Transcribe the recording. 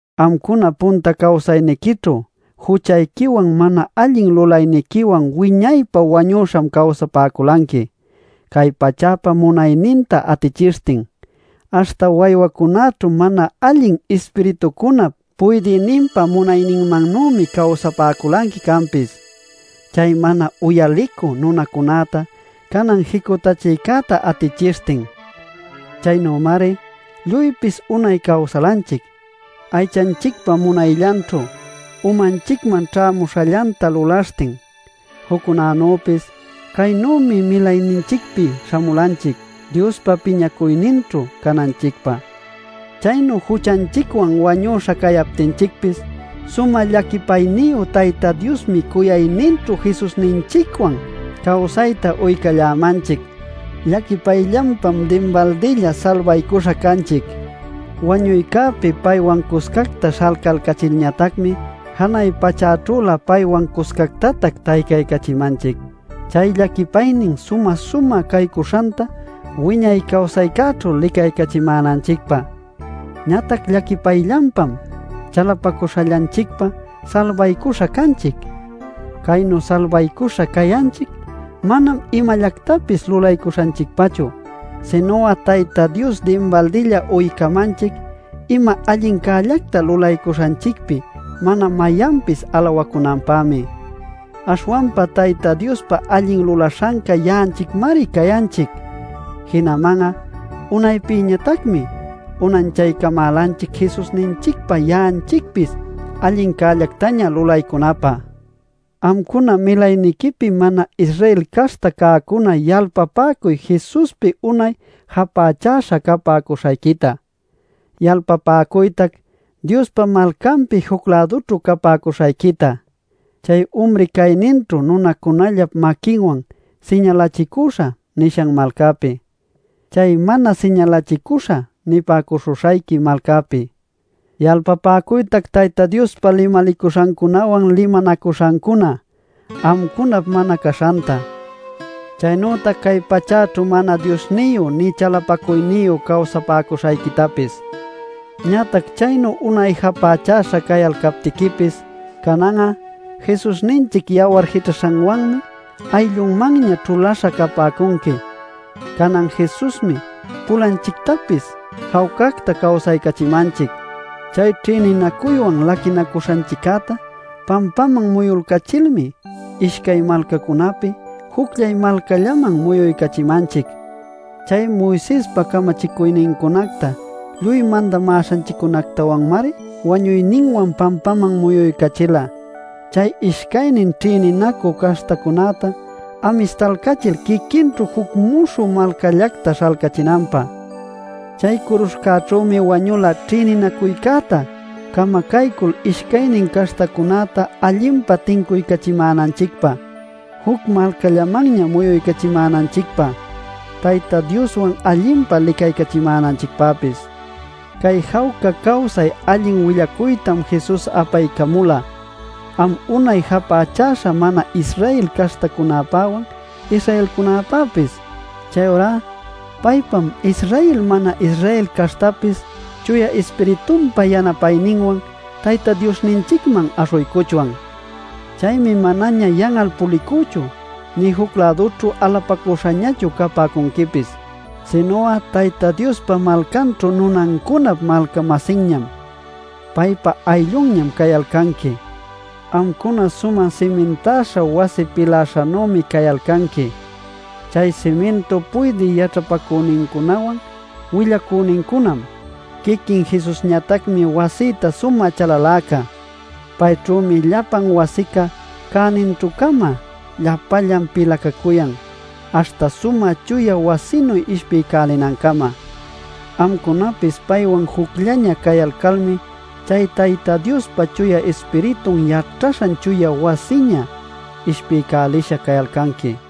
Amcuna punta cawsayniquićhu juchayquiwan mana allin lulayniquiwan wiñaypä wañüśham cawsapäculanqui cay pachäpa munayninta atichishtin. Aśhta waywacunaćhu mana allin ispiritucunap puydïninpa munayninmannümi cawsapäculanqui canpis chay mana uyalicü nunacunäta canan jicutachïcäta atichishtin. Chaynümari lluypis unay cawsalanchic, aychanchicpa munayllanćhu umanchicman ćhämuśhallanta lulaśhtin. Juccunanüpis caynümi milayninchicpi śhamulanchic Diospa piñacuyninćhu cananchicpä. Chaynu juchanchicwan wañüśha cayaptinchicpis sumä llaquipayniyu Tayta Diosmi cuyayninćhu Jesusninchicwan cawsayta uycallämanchic. Llaquipayllanpam dinbaldilla salbaycuśha canchic. Wañuycäpi paywan cuscacta śhalcalcachilñatacmi janay pachäćhülä paywan cuscactatac taycaycachimanchic chay llaquipaynin sumä-sumä caycuśhanta wiñay cawsaycäćhu licaycachimänanchicpä. Ñatac llaquipayllanpam chalapacuśhallanchicpa salbaycuśha canchic. Caynu salbaśha cayanchic manam imallactapis lulaycuśhanchicpachu, sinu'a Tayta Dios dinbaldilla uycamanchic ima allincällacta lulaycuśhanchicpi mana mayanpis alawacunanpämi. Aśhwanpa Tayta Diospa allin lulaśhanca ya'anchicmari cayanchic. Jinaman'a unaypïñatacmi unanchaycamälanchic Jesusninchicpa ya'anchicpis allincällactaña lulaycunapä. Amcuna milayniquipi mana-Israel caśhta cäcuna yalpapäcuy Jesuspi unay japächäśha capäcuśhayquita. Yalpapäcuytac Diospa malcanpi juc-lädućhu capäcuśhayquita - chay umri cayninćhu nunacunallap maquinwan “siñalachicüśha” nishan malcäpi, chay “mana siñalachicuśha” nipäcuśhuśhayqui malcäpi. Yalpapäcuytac Tayta Diospa limalicuśhancunawan limanacuśhancuna amcunap mana caśhanta, chaynütac cay pachäćhu mana Diosniyu nï chalapacuyniyu cawsapäcuśhayquitapis. Ñatac chaynu unay japächäśha cayalcaptiquipis canan'a Jesusninchic yawar jićhaśhanwanmi ayllunmanña ćhuläśha capäcunqui. Canan Jesusmi pulanchictapis jawcacta cawsaycachimanchic. Chay ćhïninacuywan laquinacuśhanchiccäta pampaman muyulcachilmi, ishcay malcacunapi jucllay malcallaman muyuycachimanchic. Chay Moisespa camachicuynincunacta lluy mandamäśhanchiccunactawanmari wañuyninwan pampaman muyuycachila, chay ishcaynin ćhïninacü caśhtacunäta amistalcachil quiquinćhu juc muśhü malcallacta śhalcachinanpä. Chay curuśhcäćhümi wañula ćhïninacuycäta camacaycul ishcaynin caśhtacunäta allinpa tincuycachimänanchicpä, juc malcallamanña muyuycachimänanchicpä, Tayta Dioswan allinpa licaycachimänanchicpäpis. Cay jawca cawsay allin willacuytam Jesus apaycamula am unay japächäśha mana-Israel caśhtacunapäwan Israelcunapäpis. Chayurá paypam Israel mana-Israel caśhtapis Chuya Ispiritunpa yanapayninwan Tayta Diosninchicman aśhuycuchwan. Chaymi manaña yan'al pulicüchu nï juc-lädućhu alapacüśhañachu capäcunquipis. Sinu'a Tayta Diospa malcanćhu nunancunap malca-masinñam, paypa ayllunñam cayalcanqui. Amcuna sumä simintäśha wasi pilaśhanümi cayalcanqui. Chay simintu puydï yaćhapacünincunawan willacünincunam. Quiquin Jesusñatacmi wasïta sumä chalaläca. Payćhümi llapan wasica cäninćhü-cama llapallan pilacacuyan, aśhta sumä chuya wasinuy ishpiycälinancama. Amcunapis paywan jucllaña cayalcalmi chay Tayta Diospa Chuya Ispiritun yaćhaśhan chuya wasiña ishpiycälisha cayalcanqui.